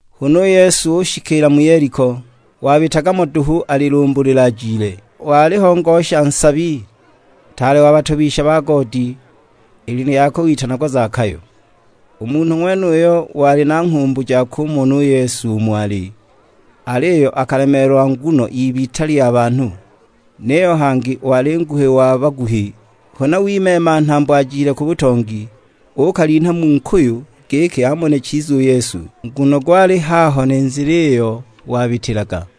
Huna u Yesu ushikiila mu Yeliko; wabitaga mo duhu alilumbulila ajile. Waliho ngosha nsabi, ntaale wa batobisha ba goodi; i lina lyakwe witanagwa Zakayo. U munhu ng'wenuyo wali na nghumbu ja kumona u Yesu umo ali, aliyo akalemeelwa nguno y'ibita lya banhu, niyo hangi wali nguhi wa baguhi. Huna wimeema nhambo ajile ku butongi, uukalinha mu nkuyu giki amone chiza u Yesu, nguno gwali haho ni nzila iyo wabitilaga.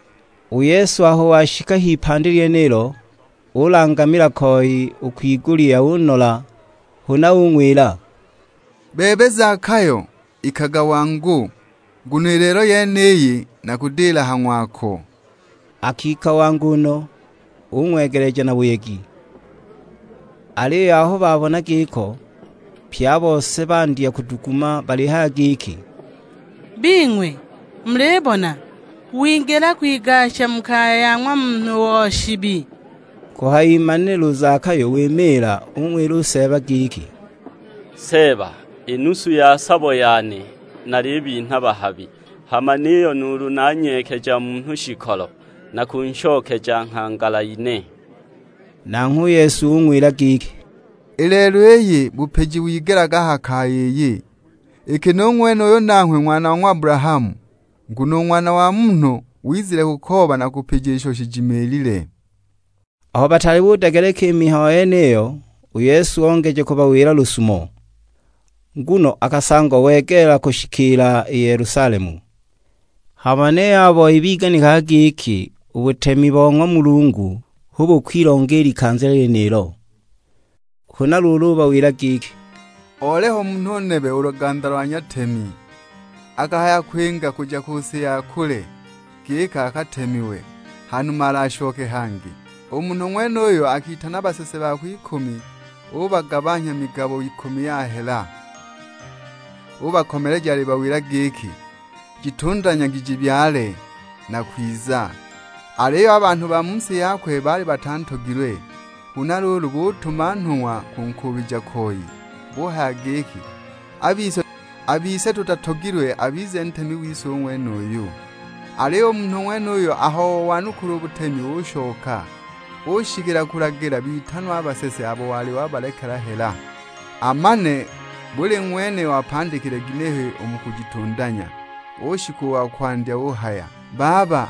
U Yesu aho washika a h'ipandi lyenilo, ulangamila koi u kwigulya unola; huna ung'wila, "Bebe Zakayo, ikaga wangu, nguno i lelo yeniyi nakudila ha ng'wako!" Akika wangu no, ung'wegeleja na buyegi. Aliyo aho babona giko, pye a bose bandya kuduguma balihaya giki, "Bing'we, mulibona, wingila kwigasha mu kaya ya ng'wa munhu o shibi!" Kuhayimanila u Zakayo wimiila, ung'wila u Seeba giki; "Seeba, i nusu ya sabo yane nalibinha bahabi; hama niyo nuulu nanyeekeja munhu shikolo, nakunshokeja nghangala ine!" Nanghwe u Yesu ung'wila giki, "I lelo iyi bupiji wigelaga a ha kaya iyi, iki nu ng'wenuyu nanghwe ng'wana wa ng'wa Abulahamu. Nguno u Ng'wana wa Munhu wizile kukooba na kupija isho shijimiilile." Aho bataali budegeleka i mihayo yeniyo, u Yesu ongeja kubawila lusumo. Nguno akasangwa wegeela kushikiila i Yelusalemu; hama niyo a boi biganikaga giki u butemi bo ng'wa Mulungu hu bukwilonga i likanza lyenilo. Huna luulu ubawila giki, "Oliho munhu nebe o luganda lo nyatemi, akahaya kwinga kuja ku si ya kule, giki akatemiwe; hanuma alashoke hangi. U munhu ng'wenuyo akitana basese bakwe ikumi ubagabanhya migabo ikumi ya hela, ubakomeleja alibawila giki, 'Jitundanyagi jiibyale; nakwiza.' Aliyo a banhu ba mu si yakwe baali batantogilwe, huna luulu butuma nhung'wa kunkuubija koi; buhaya giki, 'A bise tutatogilwe abize ntemi wise u ng'wenuyu!' Aliyo u munhu ng'wenuyo aho owanukula u butemi ushoka; ushikila kulagila bitanwe a basese abo wali wabalekela hela, amane buli ng'wene wapandikile ginehe u mu kujitundanya. Ushika wa kwandya uhaya, 'Baba,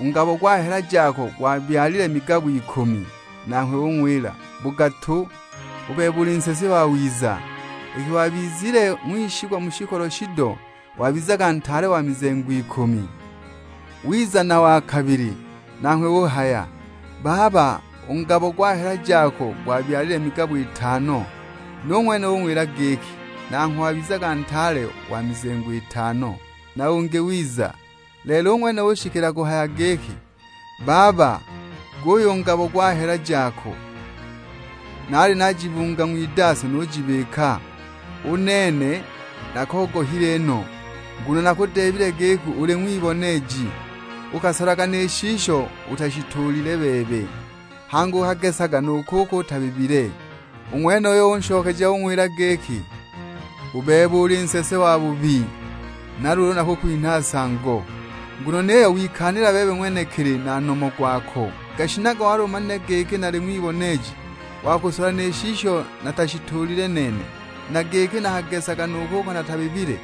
u ngabo gwa hela jako gwabyalile migabo ikumi.' Nanghwe ung'wila, 'Bugatu, u bebe uli nsese wawiza, iki wabizile ng'wishigwa mu shikolo shido, wabizaga ntaale wa mizengo ikumi.' Wiza na wa kabili, nanghwe uhaya, 'Baba, u ngabo gwa hela jako gwabyalile migabo itano.' Nu ng'wene ung'wila giki, 'Nangho wabizaga ntaale wa mizengo itano.' Na ungi wiza; lelo u ng'wene ushikila kuhaya giki, 'Baba, guyu u ngabo gwa hela jako, naali najibunga ng'widaso nujibika. U nene nakogohile no, nguno nakudeebile giki uli ng'wiboneeji, ukasolaga ni shisho utashituulile bebe, hangi ukagesaga nu kuko utabibile!' U ng'wenuyo unshokeja ung'wila giki, 'U bebe uli nsese wabubi, na luulu nakukwinha nsango, nguno niyo wikaanila bebe ng'wenekili na nomo gwako. Gashinaga wali umanile giki nali ng'wiboneeji wa kusola ni shisho natashituulile nene, na giki nakagesaga nu kuko natabibile!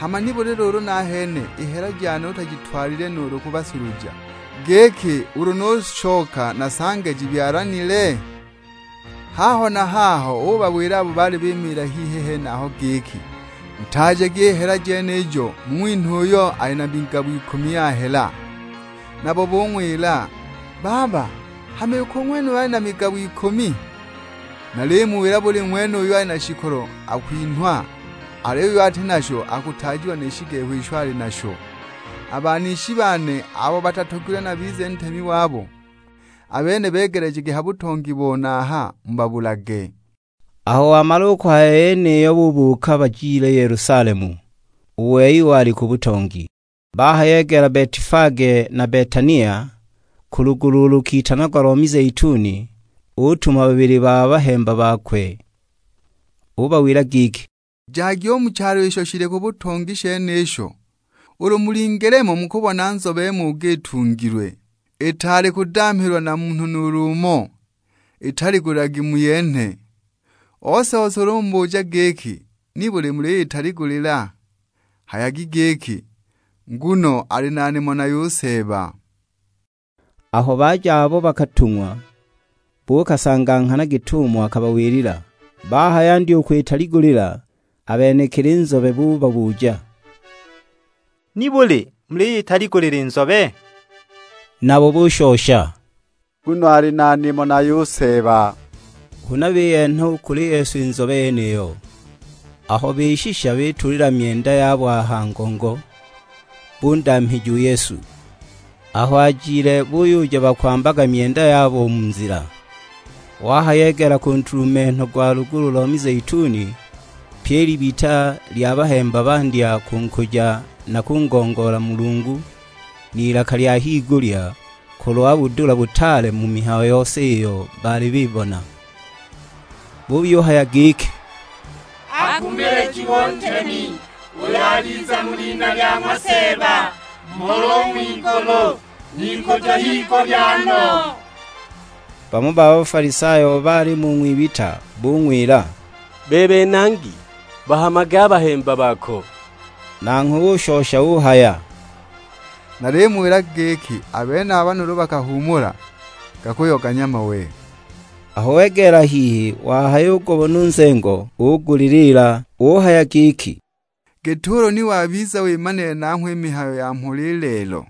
Hama nibuli luulu nahene i hela jane utajitwalile nuulu ku basuluja, giki ulu nushoka nasange jibyalanile?' Haho na haho ubawila abo baali bimiila hihi henaho giki, 'Ntaajagi i hela jenijo mung'winhe uyo ali na migabo ikumi ya hela.' Nabo bung'wila, 'Baba, hama iki u ng'wenuyo ali na migabo ikumi!' 'Nalimuwila buli ng'wene uyo ali na shikolo akwinhwa, aliyo uyo ati nasho akutaajiwa ni shigehu isho ali nasho. A banishi bane abo batatogilwe nabize ntemi wabo, a bene begelejagi ha butongi bone aha mubabulage.' " Aho wamala u kuhaya i yeniyo bubuuka bajile Yelusalemu, u wei wali ku butongi. Bahayegeela Betifage na Betania, ku lugulu ulo lukitanagwa lo mizeituni, utuma babili ba bahemba bakwe. Ubawila giki, "Jagi u mu chalo isho shili ku butongi shenisho; ulu mulingile mo mukubona nzobe muuga itungilwe, itaali kudamhilwa na munhu nuulu umo, italigulilagi muyenhe. Ose-ose ulu umubuja giki, 'Nibuli muliyitaligulila?' Hayagi giki, 'Nguno ali na nimo nayo u Seeba.' " Aho baja abo bakatung'wa, buukasanga nghana git'umo akabawilila. Bahayandya u kwitaligulila, a benekili nzobe bubabuja, "Nibuli muliyitaligulila i nzobe?" Nabo bushosha, "Nguno ali na nimo nayo u Seeba." Huna biyenha u kuli Yesu i nzobe yeniyo, aho bishisha bituulila myenda yabo a ha ngongo, bundamhija u Yesu. Aho ajile buyuja bakwambaga myenda yabo u mu nzila. Wahayegeela ku ntulumenho gwa lugulu lo mizeituni, pyi i libita lya bahemba bandya kunkuja na kungongoola Mulungu n'ilaka lya higulya kulwa budula butaale mu mihayo yose iyo baali bibona. Buyuhaya giki, "Akumilijiwe u Ntemi, uyo aliza mu lina lya ng'wa Seeba; Mhola u ng'wigulu, n'ikujo higulya no!" Bamo ba Bafalisayo abo baalimo u ng'wibita bung'wila, "Bebe Nangi, bahamage a bahemba bako!" Nanghwe ushosha uhaya, "Nalimuwila giki a benaba nuulu bakahuumula, gakuyoganya mawe." Aho wegeela hihi wahayugubona u nzengo, uuguliliila alihaya giki, "Git'ulu ni wabiza wimanile nangho i mihayo ya mhola i lelo!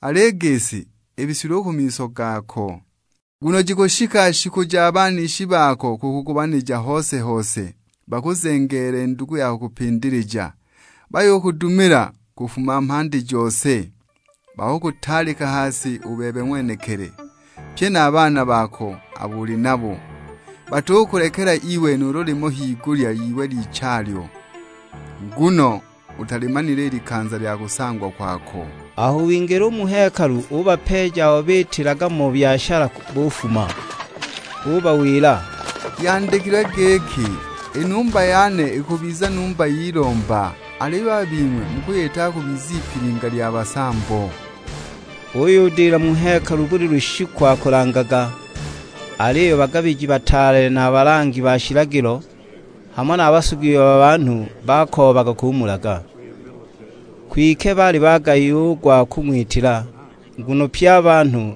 Al'i gisi, ibisilwe u ku miso gako! Nguno jikushika shiku ja banishi bako kukugobanija hose-hose, bakuzengeele ndugu ya kukupindilija, bayukudumila kufuma mhandi jose. Bakukutaalika ha si u bebe ng'wenekili, pye na a baana bako abo uli nabo; batukulekela iwe nuulu limo higulya y'iwe lichalyo, nguno utalimanile i likanza lya kusangwa kwako!" Aho wingila u mu hekalu ubapeeja abo biitilaga mo byashala bufuma. Ubawila, "Yandikilwe giki, 'I numba yane ikubiza numba y'ilomba; aliyo a bing'we mukuyitaga kubiza ipilinga lya basambo!' " Uyudila mu hekalu buli lushiku akulangaga; aliyo a bagabiji bataale na a balangi ba shilagilo, hamo na a basugi ba banhu bakoobaga kumulaga. Kwike baali bagayiwa u gwa kung'witila, nguno pye a banhu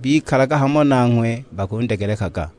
bikalaga hamo nanghwe bakundegelekaga.